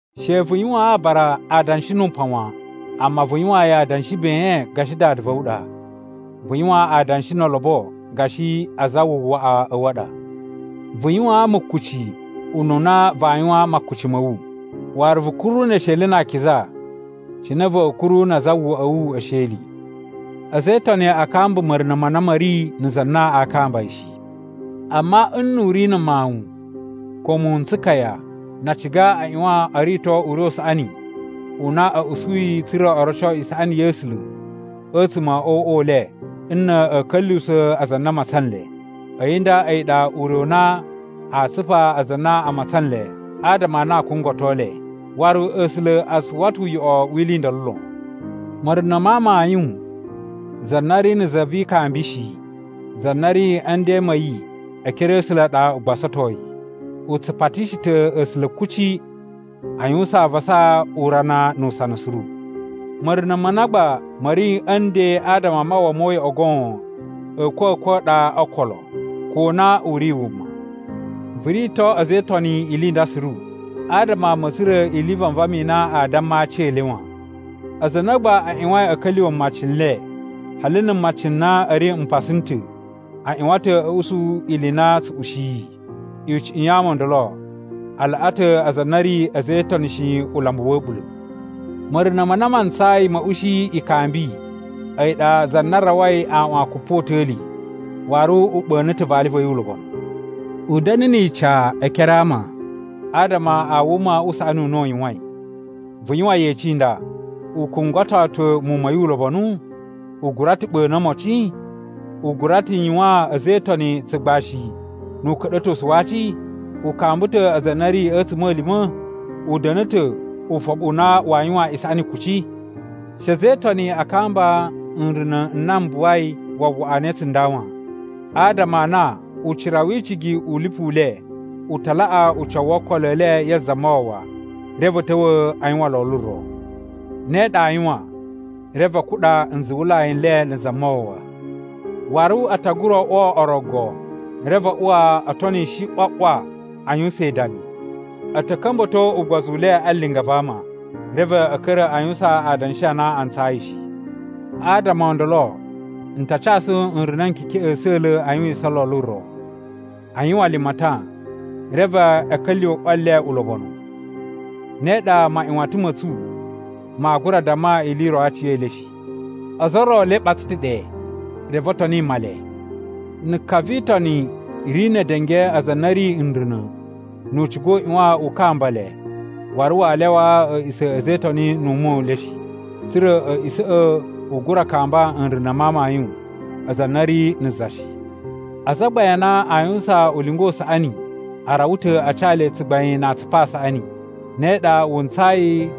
She vu yuwaan aabara adanshi nu upan wan, amma vu yuwaan yi adanshi ben gashi dada va̱ wu ɗa. Vu yuwan adanshi no olobo gashi azawawaꞌa a̱ wu a ɗa. Vu yuwaan mukuci ununa vaa yuwaan makuci ma̱ wu, waru vu kuru ne esheli na akiza cine va̱a̱ kuru na azawawaꞌa a̱ wu e esheli. A̱za̱ e Itoni a kamba ma̱runa̱ ma na ma̱ ri na̱ za na aa kamba yi shi. Amma nnu u ri na̱ mawun ko muwun n tsukaya, na a ciga a ꞌyuwan o rito ure u saꞌani u na a̱ usuyi tsa̱ra̱ o roco isaꞌani ya̱ A̱sula̱ a̱tsuma̱ o uꞌwa u le nna̱ a̱a̱ ka̱lyuwusa̱ aza a na a matsan nle. A̱yi nda a̱yi ɗa ure u na aa tsupa aza a na a matsan nle adama a na a kungwato nle. Waru A̱sula̱ a tsu uwwa ta̱ uyoꞌo wi ili i ndolo lon. Ma̱runa̱ ma amayun, za na ri na̱ za vi ikambi shi, za na ri a̱ nden ma̱ yi e ekere a̱ A̱sula̱ ɗa u gbasatoi. U tsu patishi ta̱ A̱sula̱ kuci, a yuwusan avasa urana nu usana suru. Ma̱runa̱ ma na gba ma̱ ri a̱ nden adama a mawwa mo uyoꞌo goon, a̱a̱kwa̱kwa̱ a ɗa o okolo, ko na u ri wuma. Vu rito a̱za̱ e Itoni ili i nda suru, adama ama a̱ tsura̱ ili i vanvama i na a damma aci e le wan. Aza a na gba a ꞌyuwain a̱ ka̱lyuwa̱ mmaci n le, hali na̱ mmaci n na a̱ ri mpasa n ta̱, a ꞌyuwan ta̱ a̱ usu ili i na tsu ushiyi. Icuꞌun ya ama o ndolo a laꞌa ta̱ aza a na a̱ ri a̱za̱ e Itoni shi ulambu wa̱ a̱ɓula̱. Ma̱runa̱ ma na ma ntsayi ma̱ ushi ikambi, a̱yi ɗa za na rawai aꞌwan kupota̱li waru u ɓa̱na̱ ta̱ vali va̱ yi ulobonu. U da̱na̱ ni ica e ekere a ama adama a wuma u saꞌani u na u yuwain. Vu yuwan yeci i nda: U kungwato ta̱ muwun ma̱ yi ulobonu? U gura ta̱ ɓa̱na̱ omocin? U gura ta̱ yuwaan a̱za̱ e Itoni tsugbashi nu uka̱ɗa̱tosu wa aci? U kamba ta̱ aza a na a̱ ri a̱tsuma̱lima̱? U da̱na̱ ta̱ ufoɓu u na waa yuwan isaꞌani kuci? She a̱za̱ e Itoni a kamba nruna̱ n na m buwai wawaꞌa ne tsunda wan. Adama a na ucira wi icigi u lipu u le u ta laꞌa ucawu wo okolo e le ya Zamawawa, reve a̱ ta̱wa̱ a yuwan lolo ro. Ne ɗa aa yuwan, reve a kuɗa nzuwulai n le na̱ Zamawawa. Waru a ta gura oꞌwo orogo, reve a uwa o tonishi ꞌwa ꞌwa a yuwusan idami. A̱ ta̱ ka̱mba̱to ugbozu u le a linga va ama, reve a̱ ka̱ra̱ a yuwusan adanshi a na a ntsayi shi. Adama o ndolo n ta casu nruna̱ n kekeꞌen a̱sa̱la̱ a yuwisan lolo ro. A yuwan limatan, reve a̱ ka̱lyuwa̱ ꞌwa le ulobonu. Ne ɗa maꞌyuwatan ma̱ tsu maa gura damma ili i ro a aci e le shi. Ozo o ro e le ɓatsa ta̱ ɗe, reve o toni Male. Na̱ ka vi Itoni ri ne edenge aza a na a̱ ri nruna̱, nu u ciga u ꞌyuwan u kamba le waru waa lyawaa a̱a̱ꞌisa̱ a̱ a̱za̱ e Itoni nu ume u le shi. Tsa̱ra̱ a̱a̱ꞌisa̱ꞌa̱ u gura kamba nruna̱ ma amayun aza a na a̱ ri na̱ za shi. Azagbain a na aa yuwusan ulinga u saꞌani a rawa ta̱ a ca le tsugbain na atsupu a saꞌani. Ne ɗa wu ntsayi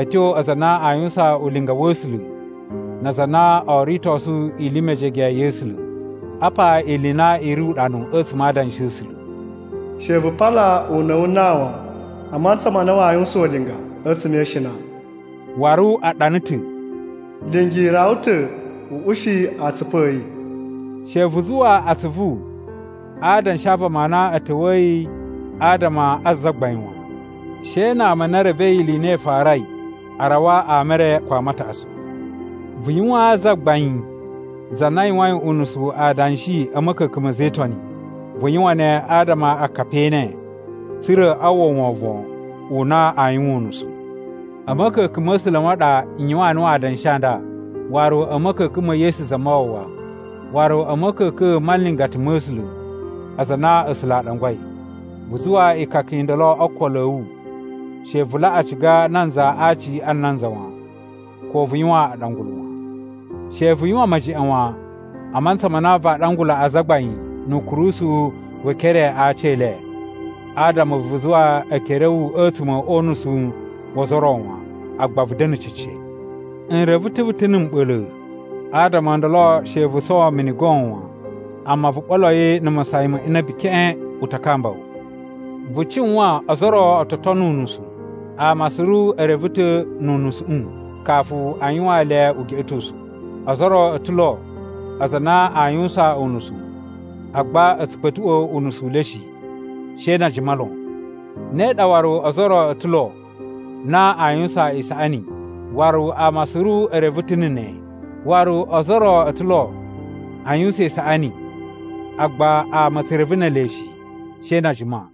a̱ tyo aza a na a yuwusan ulinga wa̱ A̱sula̱ na aza a na oo ritosu ili i mejege ya̱ A̱sula̱. Apa ili i na i ri uɗanu a̱tsuma̱ a Adanshi a̱ A̱sula̱, “She vu pala una̱ wu nan wan, a mantsa ma na waa yuwusan ulinga a̱tsuma̱ e ishina,” waru a ɗana ta̱, “Lingi rawa ta̱ u ushi atsupu a̱ yi.” She vu zuwa atsuvu a adanshi a vama a na a̱ ta̱wa̱yi adama a zagbain wan. She na ama a na e revei ili i na i farai a rawa ama e re ko ama a taꞌatsu. Vu yuwaan zagbain za na yuwain unusu adanshi a̱ ma̱ka̱ka̱n ma̱ a̱za̱ e Itoni. Vu yuwan ne adama akapi e ene, tsa̱ra̱ a uwwa wovon u na aa yuwan unusu. A̱ ma̱ka̱ka̱n ma̱ A̱sula̱ ma ɗa n yuwaan nuwu adanshi a nda, waru a̱ ma̱ka̱ka̱n ma̱ Yesu Zamawawa, waru a̱ ma̱ka̱ka̱n ma nlingata ma̱ A̱sula̱, aza a na A̱sula̱ a ɗangwai. Vu zuwa ikaka i nda o ookolo a̱ wu, she vu laꞌa ciga nanza a aci a nanza wan. Ko vu yuwan aɗangulu wan. She vu yuwan mejeꞌen wan a mantsa ma na vaa ɗangula azagbain nu ukurusu we ekere a aci e le. Adama vu zuwa ekere a̱ wu a̱tsuma̱ o unusu wo ozo o ro wan, agba vu da̱na̱ cece. N reve ta̱ vu ta̱ na̱ mɓa̱la̱. Adama o ndolo she vu sowo mini goon wan, amma vu ɓolo yi na̱ masayan ma inabi keꞌen. U ta kamba wu. Vu cuwan ozo o ro o to tono unusu, ama suru e reve ta̱ nu unusuꞌu kafu a yuwaan le ugeꞌetosu. Ozo o ro o ta̱ lo aza a na aa yuwusan unusu, agba a̱ tsu kpa̱tuꞌwa̱ unusu u le shi, she na a jima lon. Ne ɗa waru ozo o ro o ta̱ lo na aa yuwusan isaꞌani, waru ama suru e reve ta̱ na̱ ne, waru ozo o ro o ta̱ lo a yuwusan isaꞌani agba ama a̱ tsu reve ne ele shi, she na a jima.